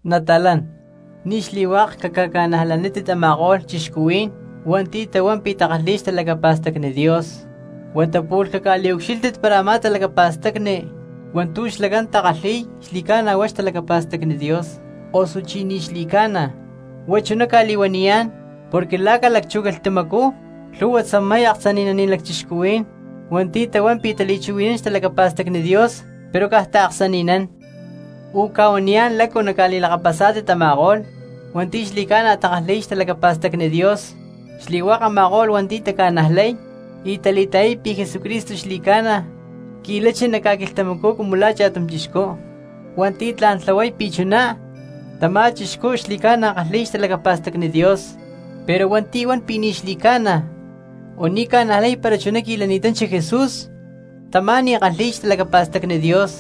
Nata̠lán, ni̠ xli̠hua̠k caca̠ca̠najlanítit a̠ma̠ko̠lh cristianos hua̠nti̠ tahuán pi̠ takalhi̠y xtalacapa̠stacni Dios, huata pu̠lh caca̠liucxílhtit para a̠má talacapa̠stacni hua̠ntu̠ xlacán takalhi̠y xli̠ca̠na huá xtalacapa̠stacni Dios, osuchí ni̠ xli̠ca̠na. Huá chuná cca̠li̠huaniyá̠n porque la̠ ca̠lacchú quilhtamacú lhu̠hua tzamay aksani̠naní̠n lacchixcuhuí̠n hua̠nti̠ tahuán pi̠ tali̠chuhui̠nán xtalacapa̠stacni Dios pero caj taaksani̠nán. Ucca̠huaniyá̠n lácu naca̠li̠lakapasá̠tit a̠ma̠ko̠lh hua̠nti̠ xli̠ca̠na takalhi̠y xtalacapa̠stacni Dios: xli̠hua̠k a̠ma̠ko̠lh hua̠nti̠ taca̠najlay y tali̠ta̠yay pi̠ Jesucristo xli̠ca̠na qui̠lachi nac ca̠quilhtamacú cumu la̠ cha̠tum chixcú, hua̠nti̠ tla̠n tlahuay pi̠ chuná, tamá cristiano xli̠ca̠na kalhi̠y xtalacapa̠stacni Dios. Pero hua̠nti̠ huan pi̠ ni̠ xli̠ca̠na o ni̠ ca̠najlay para chuná qui̠lani̠tanchi Jesús, tamá ni̠ kalhi̠y xtalacapa̠stacni Dios,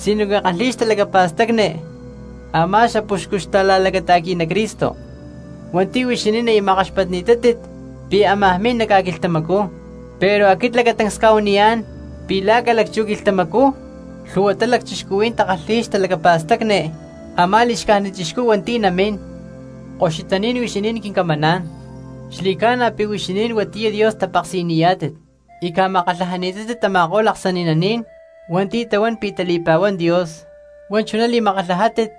sinoque kalhi̠y xtalacapa̠stacni a̠má xapuxcu xta̠la̠lacata̠qui̠ná Cristo hua̠nti̠ huixinín aya makkaxpatni̠tátit pi̠ ámaj min nac ca̠quilhtamacú. Pero aquit lacatancs cca̠huaniyá̠n pi̠ la̠ ca̠lacchú quilhtamacú lhu̠huatá lacchixcuhuí̠n takalhi̠yá xtalacapa̠stacni a̠má li̠xcájnit chixcú hua̠nti̠ namín. Koxutaní̠n huixinín quincamaná̠n, xli̠ca̠na pi̠ huixinín huatiyá Dios tapeksi̠niyá̠tit y ca̠makatlajani̠tátit tama̠ko̠lh aksani̠naní̠n hua̠nti̠ tahuán pi̠ tali̠pa̠huán Dios. Huá chuná li̠makatlajátit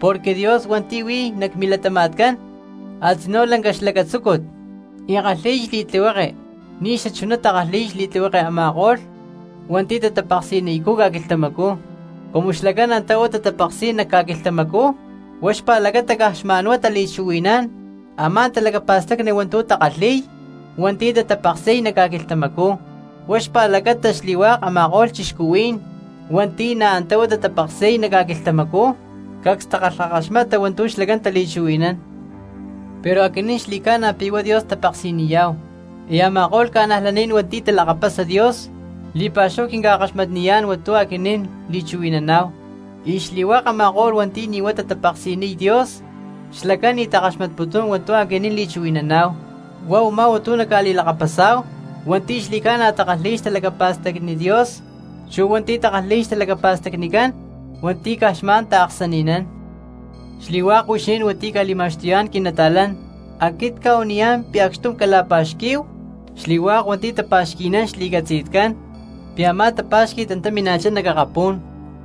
porque Dios hua̠nti̠ huí nac milatama̠tcán a̠tzinú lanca xlacatzúcut y kalhi̠y xli̠tlihueke ni̠ xachuná takalhi̠y xli̠tlihueke a̠ma̠ko̠lh hua̠nti̠ tatapeksi̠niycú ca̠quilhtamacú. Cumu xlacán antá uú tatapeksi̠y nac ca̠quilhtamacú huá xpa̠lacata caj xma̠n huá tali̠chuhui̠nán a̠má talacapa̠stacni hua̠ntu̠ takalhi̠y hua̠nti̠ tatapeksi̠y nac ca̠quilhtamacú, huá xpa̠lacata, xli̠hua̠k a̠ma̠ko̠lh cristianos hua̠nti̠ na̠ antá uú tatapeksi̠y nac ca̠quilhtamacú cacs takalhakaxmata hua̠ntu̠ xlacán tali̠chuhui̠nán. Pero aquinín, xli̠ca̠na pi̠ huá Dios tapeksi̠niyá̠hu, y a̠ma̠ko̠lh cristianos hua̠nti̠ talakapasa Dios, li̠pa̠xúhu quinca̠kaxmatniyá̠n hua̠ntu̠ aquinín li̠chuhui̠naná̠hu, y xli̠hua̠k a̠ma̠ko̠lh hua̠nti̠ ni̠ huá tatapeksi̠niy Dios xlacán ni̠ takaxmatputún hua̠ntu̠ aquinín li̠chuhui̠naná̠hu. Huá u̠má hua̠ntu̠ naca̠li̠lakapasá̠hu hua̠nti̠ xli̠ca̠na takalhi̠y xtalacapa̠stacni Dios chu̠ hua̠nti̠ takalhi̠y xtalacapa̠stacnicán hua̠nti̠ caj xma̠n taaksani̠nán. Xli̠hua̠k huixinín hua̠nti̠ cca̠li̠ma̠xtuyá̠n quinata̠lán, aquit cca̠huaniyá̠n pi̠ acxtum cala̠pa̠xquí̠hu, xli̠hua̠k hua̠nti̠ tapa̠xqui̠nán xli̠catzi̠tcán pi̠ a̠má tapa̠xqui̠t antá mina̠chá nac akapú̠n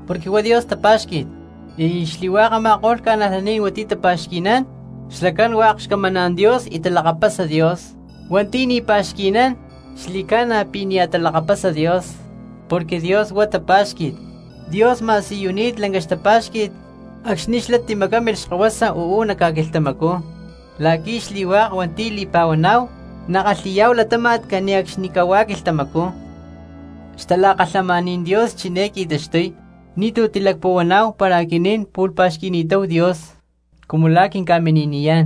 porque huá Dios tapa̠xqui̠t. Xli̠hua̠k a̠ma̠ko̠lh cristianos hua̠nti̠ tapa̠xqui̠nán xlacán hua̠k xcamaná̠n Dios y talakapasa Dios. Ama̠ko̠lh hua̠nti̠ ni̠ tapa̠xqui̠nán, xli̠ca̠na pi̠ nia̠ talakapasa Dios, porque Dios huá lanca tapa̠xqui̠t. Dios ma̠siyuni̠t lanca xtapa̠xqui̠t acxni̠ xlá timacámilh Xkahuasa uú nac ca̠quilhtamacú la̠qui̠ xli̠hua̠k hua̠nti̠ li̠pa̠huaná̠hu nakalhi̠yá̠hu latáma̠t cane̠cxnicahuá quilhtamacú. Xtalakalhamaní̠n Dios chiné qui̠taxtuy: ni̠tú tilacpuhuaná̠hu para aquinín pu̠lh pa̠xqui̠ni̠táhu Dios cumu la̠ quinca̠mini̠niyá̠n,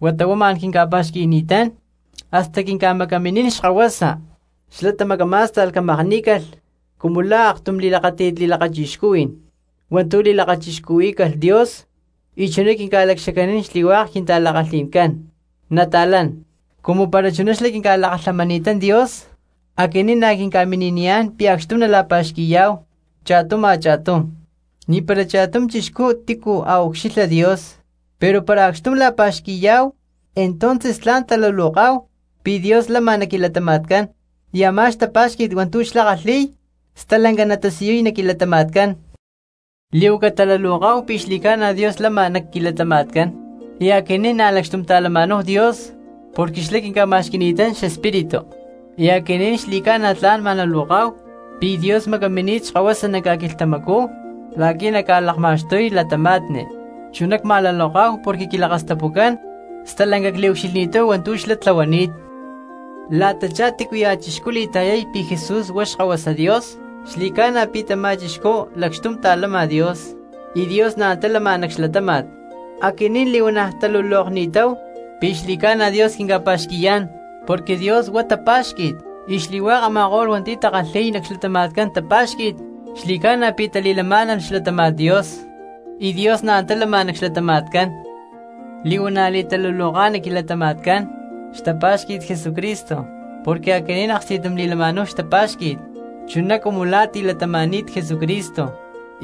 huata huá ma̠n quinca̠pa̠xqui̠ni̠tán, hasta quinca̠macaminín Xkahuasa, xlá tamacamá̠sta̠lh camakní̠calh cumu la̠ aktum tla̠n xatamaakxtakajní̠n li̠lakachixcuhui̠n hua̠ntu̠ li̠lakachixcuhuí̠calh Dios y chuná quinca̠lacxacanín xli̠hua̠k quintala̠kalhi̠ncán. Nata̠lán, cumu para chuná xlá quinca̠lakalhamani̠tán Dios, aquinín na̠ quinca̠mini̠niyá̠n pi̠ acxtum nala̠pa̠xqui̠yá̠hu cha̠tum a̠cha̠tum. Ni̠para cha̠tum cristiano tícu a̠ ucxilha Dios; pero para acxtum la̠pa̠xqui̠yá̠hu entonces tla̠n taluloká̠hu pi̠ Dios lama nac quilatama̠tcán, y a̠má xtapá̠xqui̠t hua̠ntu̠ xlá kalhi̠y stalanca natasiyuy nac quilatama̠tcán. Li̠huaca taluloká̠hu pi̠ xli̠ca̠na Dios lama nac quilatama̠tcán y aquinín na̠ lacxtum ta̠lama̠náhu Dios porque xlá quinca̠ma̠xqui̠ni̠tán xEspíritu. Y aquinín xli̠ca̠na tla̠n ma̠luloká̠hu pi̠ Dios macamini̠t Xkahuasa nac ca̠quilhtamacú la̠qui̠ naca̠lakma̠xtuy cristianos, chuná cma̠luloká̠hu porque quilakastapucán stalanca cliucxilhni̠táhu hua̠ntu̠ xlá tlahuani̠t. La̠tachá tícuya̠ cristiano li̠ta̠yay pi̠ Jesús huá Xkahuasa Dios, xli̠ca̠na pi̠ tamá cristiano lacxtum ta̠lama Dios, y Dios na̠ antá lama nac xlatáma̠t. Aquinín li̠huana̠ talulokni̠táhu pi̠ xli̠ca̠na Dios quinca̠pa̠xqui̠yá̠n, porque Dios huá tapa̠xqui̠t y xli̠hua̠k a̠ma̠ko̠lh hua̠nti̠ takalhi̠y nac xlatama̠tcán tapa̠xqui̠t xli̠ca̠na pi̠ tali̠lamá̠nalh xlatáma̠t Dios y Dios na̠ antá lama nac xlatama̠tcán. Li̠huana̠ li̠taluloka nac quilatama̠tcán xtapá̠xqui̠t Jesucristo porque aquinín aksti̠tum li̠lama̠náhu xtapá̠xqui̠t chuná cumu la̠ tilatama̠ni̠t Jesucristo,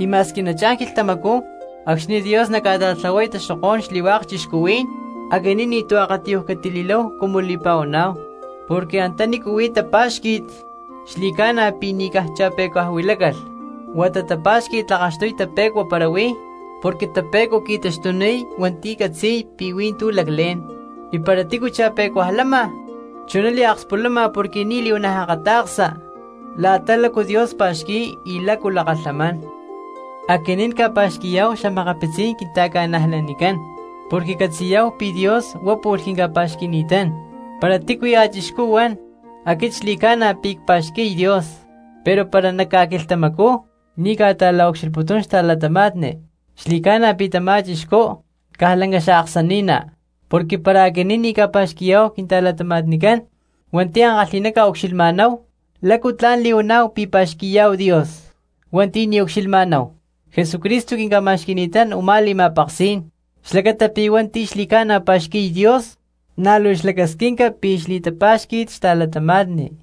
y ma̠squi nachá̠n quilhtamacú acxni̠ Dios naca̠ta̠tlahuay taxokó̠n xli̠hua̠k cristianos, aquinín ni̠tu̠ akatiyuj catili̠láhu cumu li̠pa̠huaná̠hu. Porque antanícu huí tapa̠xqui̠t xli̠ca̠na pi̠ ni̠ caj cha̠pe̠cuaj huilácalh, huata tapa̠xqui̠t tlakaxtuy tape̠cua para huí, porque tape̠cua qui̠taxtuniy hua̠nti̠ catzi̠y pi̠ hui̠ntú laclé̠n. Y para tícu cha̠pe̠cuajcú lama, chuná liakspulama porque nia̠ li̠huana̠ akata̠ksa la̠ta lácu Dios pa̠xqui̠y y lácu lakalhamán. Aquinín ca̠pa̠xqui̠yá̠hu xa̠makapitzí̠n quinta̠cristianoscán, porque catzi̠yá̠hu pi̠ Dios huá pu̠lh quinca̠pa̠xqui̠ni̠tán. Para tícuya̠ cristiano huan: “Aquit xli̠ca̠na pi̠ cpa̠xqui̠y Dios”, pero para nac ca̠quilhtamacú ni̠ ca̠ta̠la̠ucxilhputún xta̠cristianos, xli̠ca̠na pi̠ tamá cristiano caj lanca xaaksani̠ná. Porque para aquinín ni̠ ca̠pa̠xqui̠yá̠hu quinta̠cristianoscán hua̠nti̠ ankalhi̠ná ca̠ucxilhma̠náhu, ¿lácu tla̠n li̠huaná̠hu pi̠ pa̠xqui̠yá̠hu Dios hua̠nti̠ ni̠ ucxilhma̠náhu? Jesucristo quinca̠ma̠xqui̠ni̠tá̠n u̠má li̠ma̠peksí̠n xlacata pi̠ hua̠nti̠ xli̠ca̠na pa̠xqui̠y Dios na̠ luu xlacasquinca pi̠ xli̠pá̠xqui̠t xta̠cristianos.